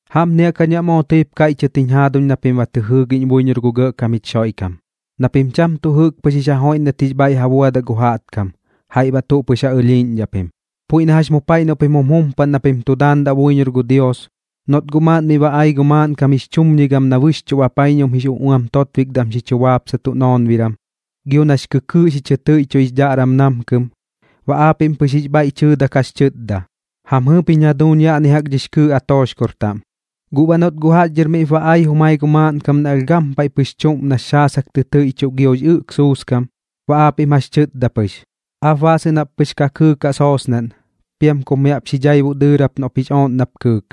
Jaꞌpni jaꞌk jañ baꞌ moo tɨip kaiꞌchɨt jiñ jaaduñ na pim ba tɨ jɨɨgiꞌñ buiñor gu Gɇꞌkam jich Xoiꞌkam, na pim cham tuꞌ jɨꞌk pɨx jix ja joiꞌndat jix bhaiꞌ ja buadaꞌ gu jaꞌtkam, jaiꞌ baꞌ tuꞌ pɨx ja ɨlhiiꞌñdhaꞌ pim. Puiꞌ na jax mu paiꞌ noꞌ pim jum jumpaꞌn na pim tu daandaꞌ buiñor gu Dios, noꞌt guꞌ maaꞌn miꞌ ba ai gu maaꞌnkam jix chumñigam na bɨxchuꞌ bapaiñum jix uꞌuam totbikdam xi chu baapsatuꞌ noonbiram, gio nax kɨkɨɨꞌ xi chɨ tɨiꞌchuꞌ jix dhaꞌram namkɨm, baꞌ aapiꞌm pɨx jix bhaiꞌ tɨtdak jax chɨtda: “Jam jɨɨp jiñ jaduuñ yaꞌni jaꞌk dhix kɨɨꞌ atooxkor taꞌm.” Guꞌ baꞌ noꞌt guꞌ jaꞌx dhɨr miꞌp ba ai jumai gu maaꞌnkam na alh gampaiꞌ pɨx chuꞌm nax xaasak tɨ tɨiꞌchuꞌ giox ɨꞌk suuskam, baꞌ aapiꞌm jax chɨtda pɨx: “Aap baasɨꞌn jap pɨx ka kɨɨkaꞌ soosnaꞌn, piam kup mi jaꞌp xi dhaibuꞌ dɨɨrap noꞌp jix ooꞌn nap kɨɨk.”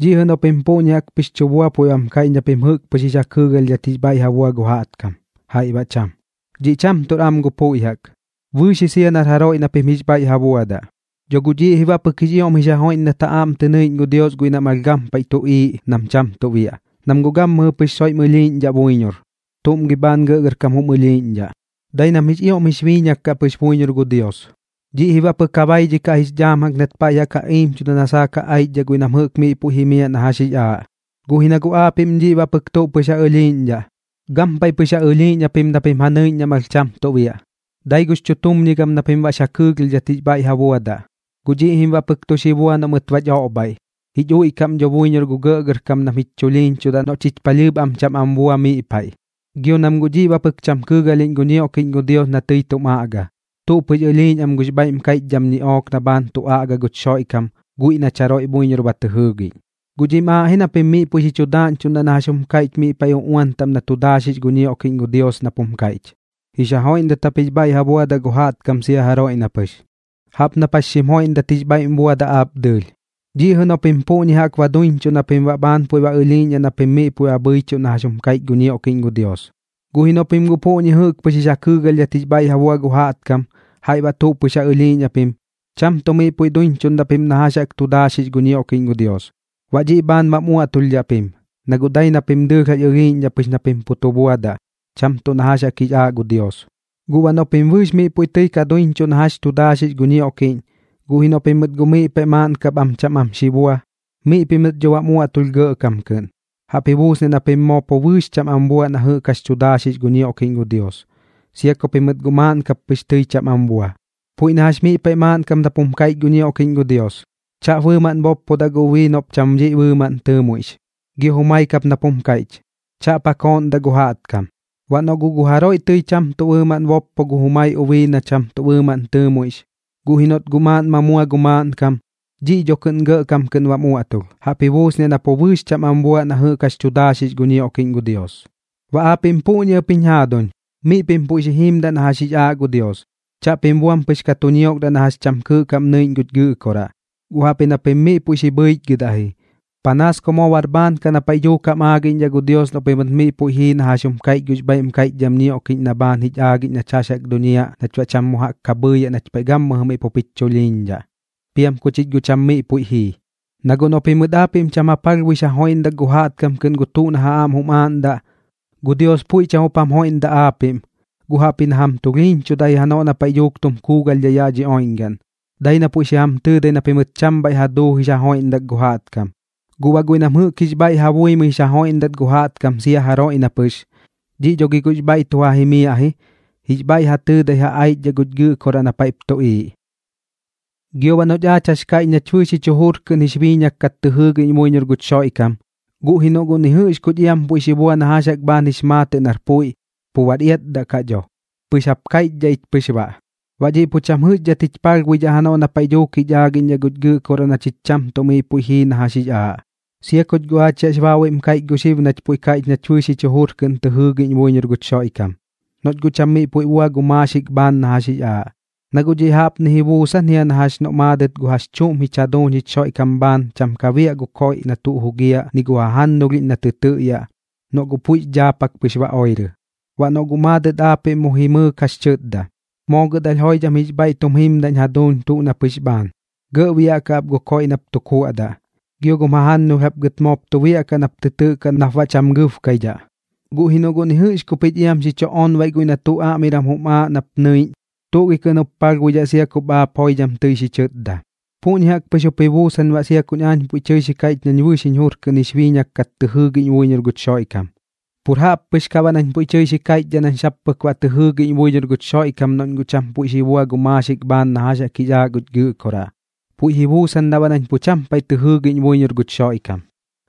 Dhiꞌ jɨꞌ noꞌ pim puꞌñi jaꞌk pɨx tu bua puiꞌ bam kaiꞌch na pim jɨꞌk pɨx jix ja kɨɨgalhdhat jix bhaiꞌ ja bua gu jaꞌtkam, jaiꞌ baꞌ cham. Dhiꞌ cham tuꞌr am gu puiꞌ jaꞌk. Bɨɨx ji sia nar jaroiꞌ na pim jix bhaiꞌ ja buadaꞌ. Dho guꞌ dhiꞌ ji baꞌ pɨk jix ioꞌm jix ja joiꞌndat ja aꞌm tɨ nɨiꞌñ gu Dios guiꞌ nam alh gampaiꞌ tuꞌiiꞌ nam cham tuꞌ biaꞌ, nam guꞌ gammɨjɨ pɨx soiꞌm ɨlhiiꞌñdhaꞌ buiñor. ¿Tuꞌm gi bhaan gɇꞌgɇrkam jum ɨlhiiꞌñdhaꞌ? Dai nam jix ioꞌm jix biiñak kaꞌ pɨx buiñor gu Dios. Dhiꞌ ji baꞌ pɨk ja baidhikaꞌ jix dhaam jaꞌk nat paiꞌ jaꞌk ja iimchuda na saak ja aichdhaꞌ guiꞌ nam jɨꞌk miꞌ puiꞌ jimiaꞌ na jax jix aaꞌ. Guꞌ ji na guꞌ aapiꞌm dhiꞌ baꞌ pɨk tuꞌ pɨx ja ɨlhiiꞌñdhaꞌ, gampaiꞌ pɨx ja ɨlhiiꞌñ japim na pim ja nɨiꞌñ nam alh cham tuꞌ biaꞌ, dai gux chutumñigam na pim baꞌx ja kɨɨgalhdhat jix bhaiꞌ ja buadaꞌ. Guꞌ dhiꞌ jim baꞌ pɨk tu xi bua noꞌ mɨt bach oꞌbhaiꞌ, jich uiꞌkaꞌ am dho buiñor gu gɇꞌkam nam jich chulhiiñchudaꞌ noꞌ chich palhɨɨp am cham am bua miꞌ paiꞌ. Gio nam guꞌ dhiꞌ baꞌ pɨk cham kɨɨgalhiꞌñ gu ñioꞌkiꞌñ gu Dios na tɨi tum aꞌga, tuꞌ pɨx ɨlhiiꞌñ am gux bhaiꞌm kaiꞌchdham ñiꞌook na bhaan tu aꞌga guch Xoiꞌkam guiꞌ nach jaroiꞌ buiñor ba tɨ jɨɨgiꞌñ. Guꞌ dhiꞌm aaꞌ ji na pim miꞌ puiꞌ xi chu daaꞌñchuꞌndaꞌ na jax jum kaiꞌch miꞌ paiꞌ uꞌuan taꞌm na tu daaxix gu ñioꞌkiꞌñ gu Dios nap jum kaiꞌch: “Jix ja joiꞌndat jap jix bhaiꞌ ja buadaꞌ gu jaꞌtkam sia jaroiꞌ na pɨx, jaꞌp nap jax xim joiꞌndat jix bhaiꞌ buadaꞌ aap dɨɨlh.” Dhiꞌ jɨꞌ noꞌ pim puꞌñi jaꞌk duiñchuꞌ na pim baꞌ bhaan puiꞌ ba ɨlhiiꞌñdhaꞌ na pim miꞌ puiꞌ bhɨichuꞌ na jax jum kaiꞌch gu ñioꞌkiꞌñ gu Dios. Guꞌ ji noꞌ pim guꞌ puꞌñi jɨꞌk pɨx jix ja kɨɨgalhiꞌñdhat jix bhaiꞌ ja bua gu jaꞌtkam, jaiꞌ baꞌ tuꞌ pɨx ja ɨlhiiꞌñ japim, cham tuꞌ miꞌ puiꞌ duiñchuꞌndaꞌ pim na jax jaꞌk tu daaxix gu ñioꞌkiꞌñ gu Dios. Baꞌ dhiꞌ bhaan bam uaꞌtulhdhaꞌ pim, na guꞌ dai na pim dɨɨlh jax ɨlhiiꞌñdhaꞌ pɨx na pim pu tu buadaꞌ, cham tuꞌ na jax jix aaꞌ gu Dios. Gu baꞌ noꞌ pim bɨɨx miꞌ puiꞌ tɨi ka duiñchuꞌ na jɨꞌk jax tu daaxix gu ñioꞌkiꞌñ, guꞌ ji noꞌ pimɨt guꞌ miꞌ paiꞌ maaꞌn kap am cham am xi bua, miꞌ pimɨt dho bam uaꞌtulh gɇꞌkam kɨꞌn, jaꞌp ji buusniaꞌ na pim moo pu bɨɨx cham am buaꞌ na jɨꞌk jax tu daaxix gu ñioꞌkiꞌñ gu Dios, sia ku pimɨt guꞌ maaꞌn kap pɨx tɨi cham am bua. Puiꞌ na jax miꞌ paiꞌ maaꞌn kap nap jum kaiꞌch gu ñioꞌkiꞌñ gu Dios: “Chaꞌp bɨɨmaꞌn boppodaꞌ gu ubii noꞌp cham dhiꞌ bɨɨmaꞌn tɨɨmuiꞌx”, gio jumai kap nap jum kaiꞌch: “Chaꞌp ja kooꞌndaꞌ gu jaꞌtkam.” Baꞌ noꞌ guꞌ gu jaroiꞌ tɨi cham tuꞌ bɨɨmaꞌn boppo gu jumai ubii na cham tuꞌ bɨɨmaꞌn tɨɨmuiꞌx, guꞌ ji noꞌt guꞌ maaꞌn ma mua gu maaꞌnkam, dhiꞌ dho kɨꞌn gɇꞌkam kɨꞌn bam uaꞌtulh, jaꞌp ji buusniaꞌ na pu bɨɨx cham am buaꞌ na jɨꞌk jax tu daaxix gu ñioꞌkiꞌñ gu Dios. Baꞌ aapiꞌm puꞌñi ɨp jiñ jaaduñ, miꞌ pim puiꞌ xi jiimdaꞌ na jax jix aaꞌ gu Dios. Chaꞌpim buam pɨx ka tu ñiokdaꞌ na jax cham kɨɨꞌ kaꞌm nɨiꞌñ guch Gɨꞌkoraꞌ, guꞌ jaꞌpji na pim miꞌ puiꞌ xi bhɨichgɨdaꞌ ji, panaas ku moo bar bhaan kaꞌ na paiꞌ dhuuk jam aagiꞌñdhaꞌ gu Dios noꞌ pimɨt miꞌ puiꞌ jii na jax jum kaiꞌch gux bhaiꞌm kaiꞌchdham ñioꞌkiꞌñ na bhaan jich aagiꞌñ nach jax jaꞌk duñiaꞌ nach baꞌ cham mu jaꞌk bhɨɨyaꞌ nach paiꞌ gammɨjɨ miꞌ pup jich chulhiiñdhaꞌ, piam ku chich guꞌ cham miꞌ puiꞌ jii. Na guꞌ noꞌ pimɨt aapiꞌm cham ja palhbuix ja joiꞌndak gu jaꞌtkam kɨꞌn gu tuꞌ na ja aꞌm jum aaꞌndaꞌ, gu Dios puiꞌ cham jup jam joiꞌndaꞌ aapiꞌm, guꞌ jaꞌpji na jam tulhiiñchudaꞌ janoꞌ na paiꞌ dhuuk tum kuugalhdhaꞌ yaꞌ dhi oiꞌñgaꞌn, dai na puiꞌ xi jam tɨɨdai na pimɨt cham bhaiꞌ ja duu jix ja joiꞌndak gu jaꞌtkam. Guꞌ baꞌ guiꞌ nam jɨꞌk jix bhaiꞌ ja buimɨi jix ja joiꞌndat gu jaꞌtkam sia jaroiꞌ na pɨx, dhiꞌ dho gi guꞌx bhaiꞌ tu ja jimiaꞌ ji, jix bhaiꞌ ja tɨɨdai ja aichdhaꞌ guch Gɨꞌkoraꞌ na paiꞌp tuꞌiiꞌ. Gio baꞌ noꞌch aach jax kaiꞌch nach bɨɨx jich jujur kɨꞌn jix biiñak kat tɨ jɨɨgiꞌñ buiñor guch Xoiꞌkam, guꞌ ji noꞌ guꞌ ni jɨꞌx kuch iam puiꞌ xi bua na jax jaꞌk bhaan jix maatɨꞌ nar puiꞌ, pu bar iatdaꞌ kaꞌ dho, pɨx jap kaiꞌchdhaꞌ ich pɨx baꞌ. Baꞌ dhiꞌ pu cham jɨꞌxdhat jich palhbuidhaꞌ janoꞌ na paiꞌ dhuuk jich aagiꞌñdhaꞌ guch Gɨꞌkoraꞌ na chich cham tuꞌ miꞌ puiꞌ jii na jax jix aaꞌ, sia kuch guꞌ aach yaꞌx baabuiꞌm kaiꞌch xib nach puiꞌ kaiꞌch nach bɨɨx jich jujur kɨꞌn tɨ jɨɨgiꞌñ buiñor guch Xoiꞌkam, noꞌch guꞌ cham miꞌ puiꞌ bua gu maaxik bhaan na jax jix aaꞌ. Na guꞌ dhiꞌ jaꞌpni jaꞌk ji buusan jia na jax noꞌ maadɨt gu jax chuꞌm jich jaduuñ jich Xoiꞌkam bhaan cham ka biaꞌ gu koiꞌ na tuꞌ jugiaꞌ ni gu jajannulhiꞌñ na tɨ tɨꞌyaꞌ, noꞌ guꞌ puiꞌx dhaapak pɨx ba oirɨ. Baꞌ noꞌ guꞌ maadɨt aapiꞌm mu jimɨɨk jax chɨtda: “Moo gɨt alh joidham jix bhaiꞌ tum jimdaꞌñ jaduuñ tuꞌ na pɨx bhaan, gɇꞌ biaꞌkaꞌ ap gu koiꞌ nap tu kuaꞌdaꞌ, gio gum jajannulh jap gɨt moop tu biaꞌkaꞌ nap tɨ tɨꞌkaꞌ nap baꞌ cham gɨbkaidhaꞌ.” Guꞌ ji noꞌ guꞌ ni jɨꞌx ku pich iam xi onbaiꞌ guiꞌ na tuꞌ aꞌmiram jum aaꞌ nap nɨiꞌñ, ¿tuꞌ gi kɨꞌn jup palhbuidhaꞌ sia kup aap miꞌ joidham tɨi xi chɨtda? Puꞌñi jaꞌk pɨx jup ji busaak baꞌ sia kuñ aañ puiꞌ tɨi xi kaiꞌch nañ bɨɨx jiñ jur kɨꞌn jix biiñak kat tɨ jɨɨgiꞌñ buiñor guch Xoiꞌkam. Pur jaꞌp pɨx kaꞌ baꞌ nañ puiꞌ kaiꞌchdhaꞌ nañ sap pɨk baꞌ tɨ jɨɨgiꞌñ buiñor guch Xoiꞌkam noꞌñ guꞌ cham puiꞌ xi bua gu maaxik bhaan na jax jix aaꞌ guch Gɨꞌkoraꞌ, puiꞌ ji buusandaꞌ baꞌ nañ pu cham paiꞌ tɨ jɨɨgiꞌñ buiñor guch Xoiꞌkam.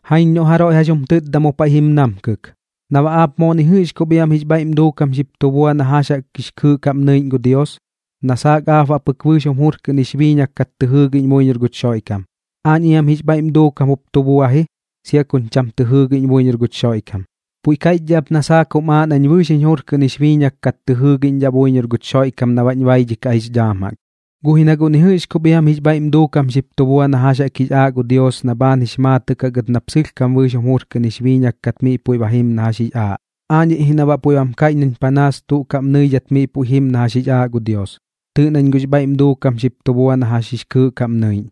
Jaiñ noꞌ jaroiꞌ jax jum tɨtda mu paiꞌ jim namkɨk: “Na baꞌ aap moo ni jɨꞌx kup iam jix bhaiꞌm duukam xip tu bua na jax jaꞌk jix kɨɨꞌ kaꞌm nɨiꞌñ gu Dios, na saak aap baꞌ pɨk bɨɨx jum jur kɨꞌn jix biiñak kat tɨ jɨɨgiꞌñ buiñor guch Xoiꞌkam. Aañ iam jix bhaiꞌm duukam jup tu bua ji, sia kuñ cham tɨ jɨɨgiꞌñ buiñor guch Xoiꞌkam. Puiꞌ kaiꞌchdhaꞌ ap na saak jum aaꞌ nañ bɨɨx jiñ jur kɨꞌn jix biiñak kat tɨ jɨɨgiꞌñdhaꞌ buiñor guch Xoiꞌkam na baꞌñ baidhikaꞌ jix dhaam jaꞌk, guꞌ ji na guꞌ ni jɨꞌx kup iam jix bhaiꞌm duukam xip tu bua na jax jix aaꞌ gu Dios na bhaan jix maatɨꞌ kaꞌ gɨt nap sɨlhkam bɨɨx jum jur kɨꞌn jix biiñak kat miꞌ puiꞌ jim na jax jix aaꞌ. Aañiꞌ ji na baꞌ puiꞌ bam kaiꞌch nañ panaas tuꞌ kaꞌm nɨidhat miꞌ puiꞌ jim na jax jix aaꞌ gu Dios. Tɨɨꞌ nañ guꞌx bhaiꞌm duukam xip tu bua na jax jix kɨɨꞌ kaꞌm nɨiꞌñ.”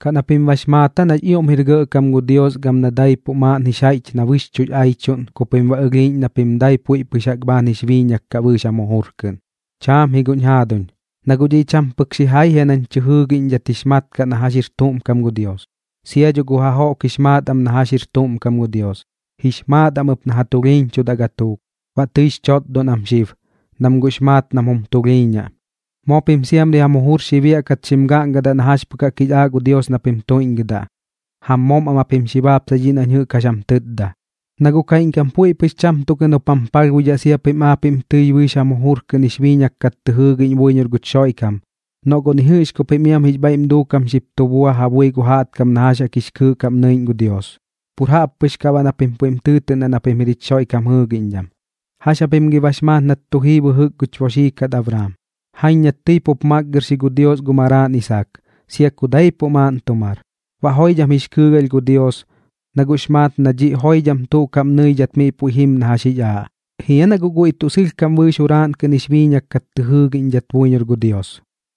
¿Kaꞌ na pim bax maat aa nax ioꞌm jir gɇꞌkam gu Dios gam na daipuꞌ maaꞌn jix jaiꞌch na bɨxchuꞌx aichuꞌn ku pim baꞌ ɨlhiiꞌñ na pim dai puiꞌ pɨx jaꞌk bhaan jix biiñak kat bɨɨx jam jujur kɨꞌn? Chaam ji guꞌñ jaaduñ, na guꞌ dhiꞌ cham pɨk xijai jia nañ tɨ jɨɨgiꞌñdhat jix mat kaꞌ na jax jir tuꞌm kam gu Dios. Sia dho gu jajoꞌk jix maat am na jax jir tuꞌm kam gu Dios, jix maat am ɨp na ja tulhiiñchudaꞌ gatuuk, baꞌ tɨix chotdon am xib, nam guꞌx maat nam jum tulhiiñaꞌ. Moo pim siamri jam jujur xi biaꞌkat xim gaꞌngadaꞌ na jax pɨk jaꞌk jix aaꞌ gu Dios na pim tuiꞌñgɨdaꞌ, jam moom am japim xi baapsai dhiꞌ nañ jɨꞌk jax jam tɨtda. Na guꞌ kaiꞌñkam puiꞌ pɨx cham tuꞌ kɨꞌn jup jam palhbuidhaꞌ sia pim aapiꞌm tɨi bɨɨx jam jujur kɨꞌn jix biiñak kat tɨ jɨɨgiꞌñ buiñor guch Xoiꞌkam, noꞌ guꞌ ni jɨꞌx ku pim iam jix bhaiꞌm duukam xip tu bua ja bui gu jaꞌtkam na jax jaꞌk jix kɨɨꞌ kaꞌm nɨiꞌñ gu Dios, pur jaꞌp pɨx kaꞌ baꞌ na pim puiꞌm tɨɨtɨꞌndaꞌ na pim jir jich Xoiꞌkam jɨɨgiꞌñdham. ¿Jax japim gi bax maat nat tu jii bɨjɨk guch boxii kat Abraam? Jaiñ nat tɨi pup makgɨrxi gu Dios gu maraaꞌn Isaak, sia ku daipuꞌ maaꞌn tu mar. Baꞌ joidham jix kɨɨgalh gu Dios, na guꞌx maat na dhiꞌ joidham tuꞌ kaꞌm nɨidhat miꞌ puiꞌ jim na jax jix aaꞌ. ¿Jia na guꞌ guiꞌ tuꞌ sɨlhkam bɨɨx juraaꞌn kɨꞌn jix biiñak kat tɨ jɨɨgiꞌñdhat buiñor gu Dios?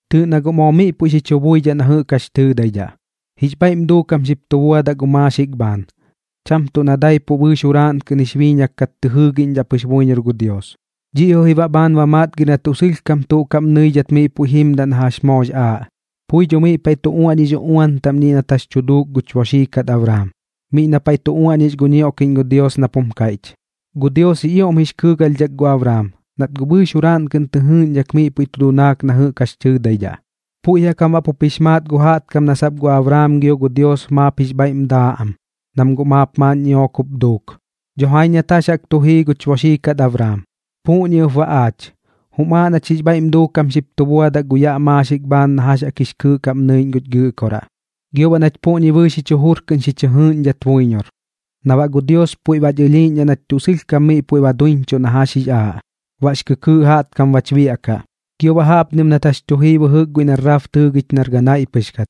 Tɨɨꞌ na guꞌ moo miꞌ puiꞌ xi chu buidhaꞌ na jɨꞌk jax tɨɨdaidhaꞌ, jix bhaiꞌm duukam xip tu buadaꞌ gu maaxik bhaan, cham tuꞌ na daipuꞌ bɨɨx juraaꞌn kɨꞌn jix biiñak kat tɨ jɨɨgiꞌñdhaꞌ pɨx buiñor gu Dios. Dhiꞌ jɨꞌ ji baꞌ bhaan ba matgir na tuꞌ sɨlhkam tuꞌ kaꞌm nɨidhat miꞌ puiꞌ jimdat na jax jaꞌk moox aaꞌ. Pui dho miꞌ paiꞌ tu uaꞌñix uꞌuan taꞌm dhiꞌ nat jax tu duuk gux boxii kat Abraam, miꞌ na paiꞌ tu uaꞌñix gu ñioꞌkiꞌñ gu Dios nap jum kaiꞌch: “Gu Dios jix ioꞌm jix kɨɨgalhdhak gu Abraam, nat guꞌ bɨɨx juraaꞌn kɨꞌn tɨjɨɨꞌñdhat miꞌ puiꞌ tu dunaak na jɨꞌk jax tɨɨdaidhaꞌ.” Puiꞌ jaꞌk jam baꞌ pup jix maat gu jaꞌtkam na sap gu Abraam gio gu Dios maap jix bhaiꞌm daaꞌ am, nam guꞌ maap maaꞌn ñiꞌook jup duuk. Dho jaiñ nat jax jaꞌk tu jii guch boxii kat Abraam. Puꞌñi ɨp baꞌ aach xib, jum aaꞌ nach jix bhaiꞌm duukam xip tu buadaꞌ gu yaꞌ maaxik bhaan na jax jix kɨɨꞌ kaꞌm nɨiꞌñ guch Gɨꞌkoraꞌ, gio baꞌ nach puꞌñi bɨɨx jich jujur kɨꞌn xi chɨ jɨɨꞌñdhat buiñor, na baꞌ gu Dios puiꞌ bach ɨlhiiꞌñdhaꞌ nach tuꞌ sɨlhkam miꞌ puiꞌ ba duiñchuꞌ na jax jix aaꞌ, baꞌx kɨkɨɨꞌ jaꞌtkam bach biaꞌkaꞌ. Gio jaꞌpni ɨp nat jax tu jii bɨjɨk guiꞌ na Raab tɨɨgich nar ganaiꞌ pɨx kat.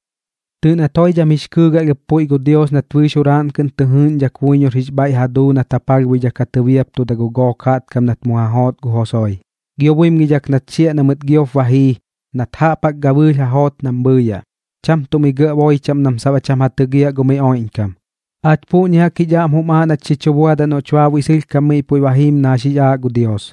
Tɨɨꞌ nat joidham jix kɨɨgalh ɨp puiꞌ gu Dios nat bɨɨx juraaꞌn kɨꞌn tɨ jɨɨgiꞌñdhak buiñor jix bhaiꞌ ja duu nat ja palhbuidhak ja tɨbiaptuda gu gook jaꞌtkam nat mu ja joot gu Josue. Gio buimgidhak nat xiaꞌ na mɨt giop ba jii, nat jaꞌp jaꞌk gabɨɨlh ja joot nam bhɨɨyaꞌ, cham tuꞌ mi gɇꞌ boi chaꞌm nam sap baꞌ cham ja tɨgiaꞌ gu miꞌ oiꞌñkam. Aach puꞌñi jaꞌk jich aꞌm jup jum aaꞌ nach xi chu buadaꞌ noꞌch baabuiꞌ sɨlhkam miꞌ puiꞌ ba jiim na jax jix aaꞌ gu Dios.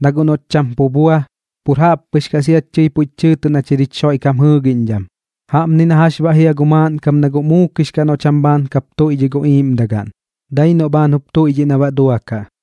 Na guꞌ noꞌch cham pu bua, pur jaꞌp pɨx kaꞌ siach tɨi puiꞌch tɨɨtɨꞌ nach jir jich Xoiꞌkam jɨɨgiꞌñdham. Jaꞌpni na jax baꞌ jia gu maaꞌnkam na guꞌ muukix kaꞌ noꞌ cham bhaan kap tuiꞌdhiꞌ gu iiꞌmdagaꞌn, dai noꞌ bhaan jup tuiꞌdhiꞌ na baꞌ duakaꞌ.